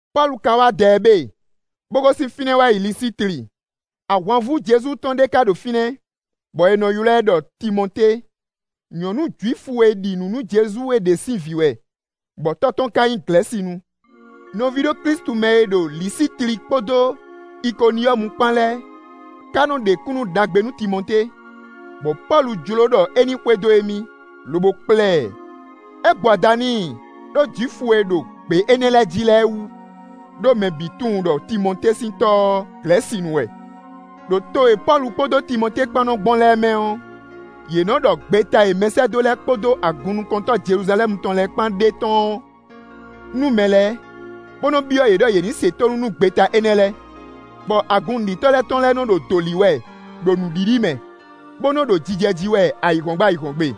Pɔ́lu ka wá Dɛɛbe, bó gosín fínɛ́ wá Lisitli. Ahwanvú Jezu tɔn ɖé ka ɖo fínɛ́, bɔ è nɔ ylɔ́ ɛ ɖɔ Timɔtée; nyɔ̌nu Jwifu e ɖi nǔ nú Jezu é ɖě sín vǐ wɛ, bɔ tɔ́ tɔn ka nyí Glɛ̌sinu. Nɔví ɖo Klísu mɛ e ɖo Lisitli kpódó Ikoniyɔ́mu kpán lɛ́ɛ ka nɔ ɖe kúnnu ɖagbe nú Timɔtée; bɔ Pɔ́lu jló ɖɔ é ní xwedó émí, lobo kplá ɛ; é gbo ada n'i, ɖó Jwifu e ɖo gbě énɛ́ lɛ́ɛ jí lɛ́ɛ wú; ɖó mɛ bǐ tunwun ɖɔ Timɔtée sín tɔ́ ɔ́, Glɛ̌sinu wɛ. Đo to e Pɔ́lu kpódó Timɔtée kpán nɔ gbɔn lɛ́ɛ mɛ ɔ́, yě nɔ́ ɖɔ gbeta e mɛsɛ́dó lɛ́ɛ kpódó agunnukɔntɔ́ Jeluzalɛ́mu tɔn lɛ́ɛ kpán ɖe tɔ́n ɔ́ nú mɛ lɛ́ɛ, bó nɔ́ byɔ́ yě ɖɔ yě ní se tónú nú gbeta énɛ́ lɛ́ɛ. Bɔ agun nǔɖitɔ́ lɛ́ɛ tɔn lɛ́ɛ nɔ ɖo dǒ lí wɛ ɖo nǔɖiɖi mɛ, bó nɔ́ ɖo jijɛ jí wɛ ayǐhɔ́ngbe ayǐhɔ́ngbe.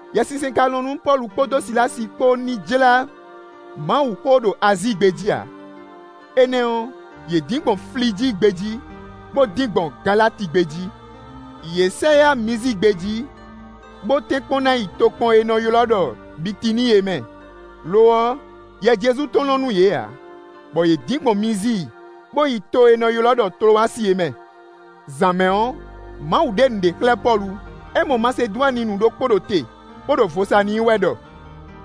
Yɛsinsɛn ka lɔn nú Pɔ́lu kpódó Silási kpó ní jlá Mawuxó ɖo Azíi gbé jí ǎ, énɛ́ ɔ́, yě dín gbɔn Flijíi gbé jí, bó dín gbɔn Galati gbé jí. Yě sɛ yá Mizíi gbé jí, bó tɛ́nkpɔ́n ná yi tokpɔn e è nɔ ylɔ́ ɖɔ Bitiníi é mɛ; lo ɔ́, Yɛ Jezu tɔn lɔn nú yě ǎ, bɔ yě dín gbɔn Mizíi, bó yi to e è nɔ ylɔ́ ɖɔ Tlowasi é mɛ. Zǎn mɛ ɔ́, Mawu ɖe nǔɖé xlɛ́ Pɔ́lu: é mɔ Masedwaninu ɖokpó ɖo te, bó ɖo vo sa n'i wɛ ɖɔ: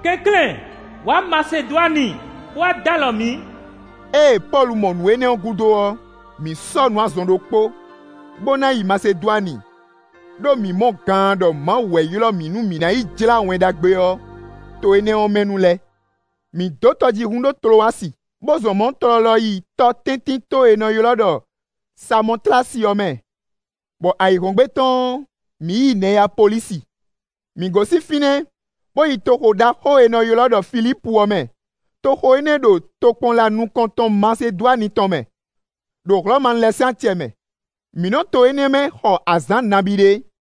“Kɛnklɛ́n wǎ Masedwani, bó wá dó alɔ mǐ.” Ée Pɔ́lu mɔ nǔ énɛ́ ɔ́ gúdo ɔ́, mǐ sɔ́ nǔ, azɔn ɖokpó, bó ná yi Masedwani, ɖó mǐ mɔ gaan ɖɔ Mawu wɛ ylɔ́ mǐ, nú mǐ ná yi jlá Wɛn Ɖagbe ɔ́ to énɛ́ ɔ́ mɛ nu lɛ́ɛ. Mǐ dǒ tɔjíhún ɖo Tlowasi, bó zɔn mɔ̌ tlɔlɔ yi tɔtɛ́ntinto e è nɔ ylɔ́ ɖɔ Samɔtlási ɔ́ mɛ, bɔ ayǐhɔ́ngbe tɔn ɔ́, mǐ yi Nɛyapolísi. Mǐ gosín fínɛ́, bó yi toxo ɖaxó e è nɔ ylɔ́ ɖɔ Filípu ɔ́ mɛ; toxo énɛ́ ɖo tokpɔnla nukɔntɔn Masedwani tɔn mɛ, ɖo Hlɔ̌manu lɛ́ɛ sín acɛ mɛ. Mǐ nɔ to énɛ́ mɛ xɔ azǎn nabí ɖé.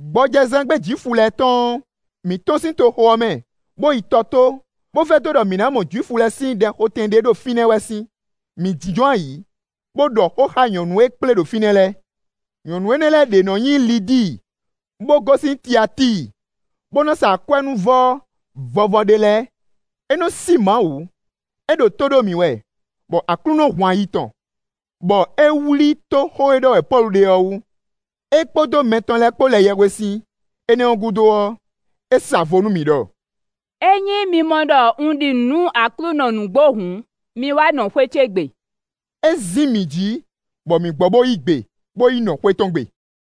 Gbɔjɛzán gbe Jwifu lɛ́ɛ tɔn ɔ́, mǐ tɔ́n sín toxo ɔ́ mɛ, bó yi tɔ tó, bó vɛdó ɖɔ mǐ ná mɔ Jwifu lɛ́ɛ sín ɖɛxotɛn ɖé ɖo fínɛ́ wɛ sín. Mǐ jínjɔ́n ayǐ, bó ɖɔ xó xá nyɔ̌nu e kplé ɖo fínɛ́ lɛ́ɛ. Nyɔ̌nu énɛ́ lɛ́ɛ ɖě nɔ nyí Lidíi, bó gosín Tiatíi, bó nɔ́ sa akwɛ́núvɔ vɔvɔ ɖé lɛ́ɛ; é nɔ sí Mawu; é ɖo tó ɖó mǐ wɛ, bɔ Aklúnɔ hun ayi tɔn, bɔ é wlí tó xó e ɖɔ wɛ Pɔ́lu ɖe ɔ́ wú. É kpódó mɛ tɔn lɛ́ɛ kpó lɛ yɛhwesin; énɛ́ ɔ́ gúdo ɔ́, é sa vo nú mǐ ɖɔ: “Ényí mi mɔ ɖɔ un ɖi nǔ nú Aklúnɔ nǔgbó hǔn, mi wá nɔ xwé ce gbe.” É zín mǐ jǐ bɔ mǐ gbɔ bó yí gbe, bó yi nɔ xwé tɔn gbe.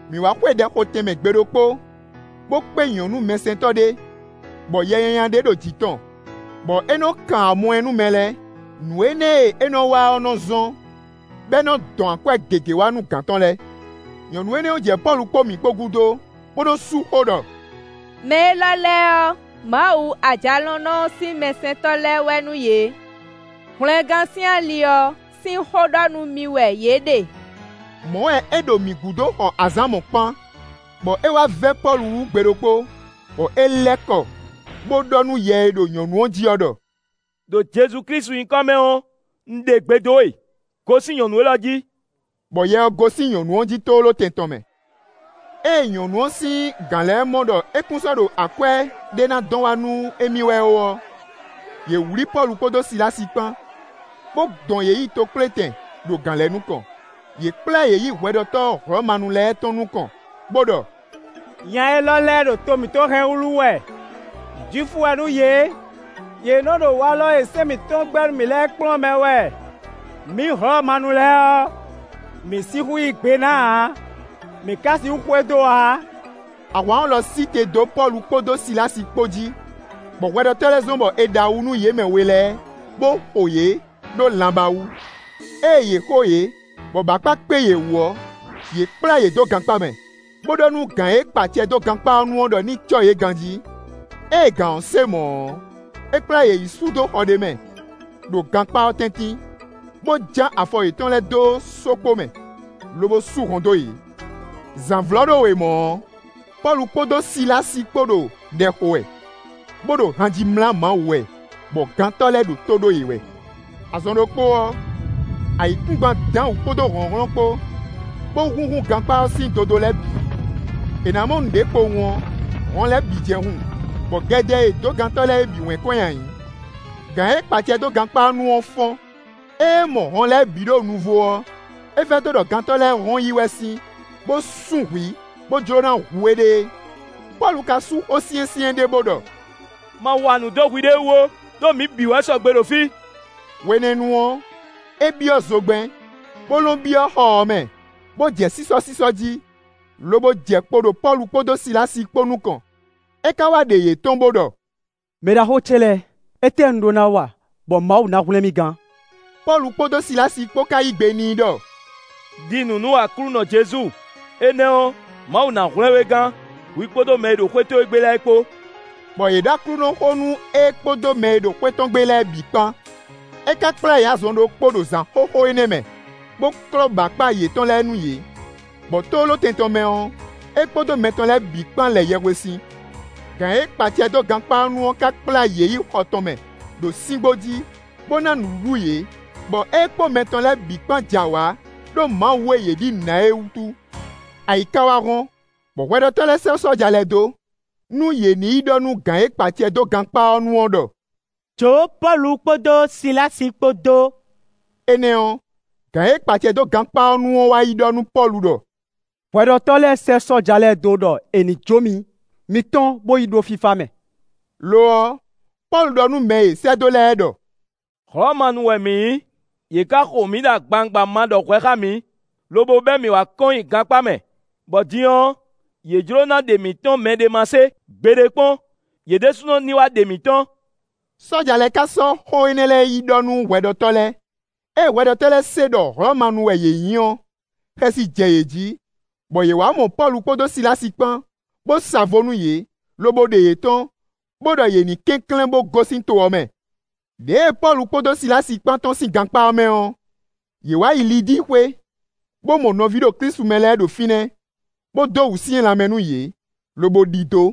Mǐ wá xwe ɖɛxotɛnmɛ gbe ɖokpó, bó kpé nyɔ̌nu mɛsɛntɔ́ ɖé, bɔ yɛ nyanya ɖé ɖo jǐ tɔn, bɔ é nɔ kan amɔɛ nú mɛ lɛ́ɛ. Nǔ énɛ́ e é nɔ wa ɔ́ nɔ zɔ́n, bɔ é nɔ dɔn akwɛ́ gěgé wá nú gǎn tɔn lɛ́ɛ. Nyɔ̌nu énɛ́ ɔ́ jɛ Pɔ́lu kpó mǐ kpó gúdo, bó nɔ sú xó ɖɔ: “Mɛ élɔ́ lɛ́ɛ ɔ́, Mawu Ajalɔ̌nlɔn sín mɛsɛntɔ́ wɛ nú yě; hwlɛngán sín ali ɔ́ sín xó ɖɔ nú mi wɛ yě ɖe.” Mɔ̌ wɛ é ɖo mǐ gúdo xɔ azǎn mɔ̌kpán, bɔ é wá vɛ́ Pɔ́lu wú gbe ɖokpó, bɔ é lɛ́ kɔ bó ɖɔ nú yɛ e ɖo nyɔ̌nu ɔ́ jí ɔ́ ɖɔ: “Đo Jezu Klísu nyǐkɔ mɛ ɔ́, un ɖe gbe dó we: gosín nyɔ̌nu élɔ́ jí;” bɔ yɛ ɔ́ gosín nyɔ̌nu ɔ́ jí tlóló tɛn tɔn mɛ. Ée nyɔ̌nu ɔ́ sín gǎn lɛ́ɛ mɔ ɖɔ é kún sɔ́ ɖo akwɛ́ ɖé ná dɔn wá nú émí wɛ ó ɔ́, yě wlǐ Pɔ́lu kpódó Silási kpán, bó dɔn yě yi tokplétɛn ɖo gǎn lɛ́ɛ nukɔn; yě kplá yě yi hwɛɖɔtɔ́ Hlɔ̌manu lɛ́ɛ tɔn nukɔn, bó ɖɔ: “Nya élɔ́ lɛ́ɛ ɖo to mǐtɔn hɛn wúlú wɛ; Jwifu wɛ nú yě, yě nɔ ɖo walɔ e sɛ́n mǐtɔn gbɛ́ nú mǐ lɛ́ɛ kplɔ́n mɛ wɛ; mǐ Hlɔ̌manu lɛ́ɛ ɔ́, mǐ sixú yí gbe ná ǎ; mǐ ka sixú xwedó ǎ.” Ahwan ɔ́ lɔ sí te dó Pɔ́lu kpódó Silási kpó jí, bɔ hwɛɖɔtɔ́ lɛ́ɛ zɔ́n bɔ è ɖe awu nú yě mɛ we lɛ́ɛ, bó xo yě ɖó lanbá wú. Ée yě xo yě, bɔ bǎkpa kpé yě wú ɔ́, yě kplá yě dó gankpá mɛ, bó ɖɔ nú gǎn e kpa acɛ dó gankpá ɔ́ nu ɔ́ ɖɔ ní cɔ́ yě ganjí. Ée gǎn ɔ́ se mɔ̌ ɔ́, é kplá yě yi sú dó xɔ ɖé mɛ, ɖo gankpá ɔ́ tɛ́ntin, bó ján afɔ yětɔn lɛ́ɛ dó sókpo mɛ, lobo sú hɔn dó yě. Zǎnvlɔ́ɖówe mɔ̌ ɔ́, Pɔ́lu kpódó Silási kpó ɖo ɖɛ xo wɛ, bó ɖo han ji mlá Mawu wɛ, bɔ gantɔ́ lɛ́ɛ ɖo tó ɖó yě wɛ. Azɔn ɖokpó ɔ́, ayǐkúngban dán wǔ kpódó hlɔ̌nhlɔ́n kpó, bó húnhún gankpá ɔ́ sín dodó lɛ́ɛ bǐ; è nǎ mɔ nǔɖé kpowun ɔ́, hɔn lɛ́ɛ bǐ jɛ́n hun, bɔ gɛdɛ e è dǒ gantɔ́ lɛ́ɛ é bǐ wɛ́n kɔn nyi ayǐ. Gǎn e kpa acɛ dó gankpá ɔ́ nu ɔ́ fɔ́n; ée é mɔ hɔn lɛ́ɛ bǐ ɖo nuvo ɔ́, é vɛdó ɖɔ gantɔ́ lɛ́ɛ hɔn yi wɛ sín, bó sún hwǐ, bó jló ná hu éɖée. Pɔ́lu ka sú xó syɛ́nsyɛ́n ɖé, bó ɖɔ: “Ma wa nǔ dó hwiɖée wú ó, ɖó mǐ bǐ wɛ sɔgbe ɖo fí.” Hwenɛ́nu ɔ́, é byɔ́ zogbɛ́n, bó lɔ́n byɔ́ xɔ ɔ́ mɛ, bó jɛ sísɔ́sísɔ́ jí, lobo jɛ kpo ɖo Pɔ́lu kpódó Silási kpó nukɔn. É ka wá ɖe yě tɔ́n, bó ɖɔ: “Mɛɖaxó ce lɛ́ɛ! Étɛ́ un ɖó ná wa bɔ Mawu ná hwlɛ́n mì gán?” Pɔ́lu kpódó Silási kpó ka yí gbe n'i ɖɔ: “Đi nǔ nú Aklúnɔ Jezu, énɛ́ ɔ́, Mawu ná hwlɛ́n we gán, hwi kpódó mɛ e ɖo xwé towe gbe lɛ́ɛ kpó.” Bɔ yě ɖɔ Aklúnɔxó nú é kpódó mɛ e ɖo xwé tɔn gbe lɛ́ɛ bǐ kpán. É ka kplá yě azɔn ɖokpó ɖo zǎn xóxó énɛ́ mɛ, bó klɔ́ bǎkpa yětɔn lɛ́ɛ nú yě, bɔ tlóló tɛn tɔn mɛ ɔ́, é kpódó mɛ tɔn lɛ́ɛ bǐ kpán lɛ yɛhwesin. Gǎn e kpa acɛ dó gankpá ɔ́ nu ɔ́ ka kplá yě yi xɔ tɔn mɛ, ɖo síngbó jí, bó ná nǔɖuɖu yě, bɔ é kpó mɛ tɔn lɛ́ɛ bǐ kpán jɛ awǎ ɖó Mawu e yě ɖi nǔ ná é wútu. Ayǐ ka wá hɔ́n, bɔ hwɛɖɔtɔ́ lɛ́ɛ sɛ́ sɔ́ja lɛ́ɛ dó, nú yě ní yi ɖɔ nú gǎn e kpa acɛ dó gankpá ɔ́ nu ɔ́ ɖɔ: “Jǒ Pɔ́lu kpódó Silási kpó dó;” énɛ́ ɔ́, gǎn e kpa acɛ dó gankpá ɔ́ nu ɔ́ wá yi ɖɔ nú Pɔ́lu ɖɔ: “Hwɛɖɔtɔ́ lɛ́ɛ sɛ́ sɔ́ja lɛ́ɛ dó ɖɔ è ní jó mi; mi tɔ́n bo yi ɖo fífá mɛ.” Lo ɔ́, Pɔ́lu ɖɔ nú mɛ e è sɛ́ dó lɛ́ɛ ɖɔ: “Hlɔ̌manu wɛ mǐ nyí; yě ka xo mǐ ɖo agbawungba ma ɖɔ hwɛ xá mǐ, lobo bɛ́ mǐ wá kɔn nyi gankpá mɛ; bɔ din ɔ́, yě jló ná ɖe mǐ tɔ́n mɛɖé ma se; gbeɖé kpɔ́n, yě ɖésúnɔ ní wá ɖe mǐ tɔ́n.” Sɔ́ja lɛ́ɛ ka sɔ́ xó énɛ́ lɛ́ɛ yi ɖɔ nú hwɛɖɔtɔ́ lɛ́ɛ; ée hwɛɖɔtɔ́ lɛ́ɛ se ɖɔ Hlɔ̌manu wɛ yě nyí ɔ́, xɛsi jɛ yě jí, bɔ yě wǎ mɔ Pɔ́lu kpódó Silási kpán, bó sa vo nú yě, lobo ɖe yě tɔ́n, bó ɖɔ yě nǐ kɛnklɛ́n bó gosín to ɔ́ mɛ. Đěe Pɔ́lu kpódó Silási kpán tɔ́n sín gankpá ɔ́ mɛ ɔ́, yě wǎ yi Lidíi xwé, bó mɔ nɔví ɖo Klísu mɛ lɛ́ɛ ɖo fínɛ́, bó dó wǔsyɛ́n lanmɛ nú yě, lobo ɖidó.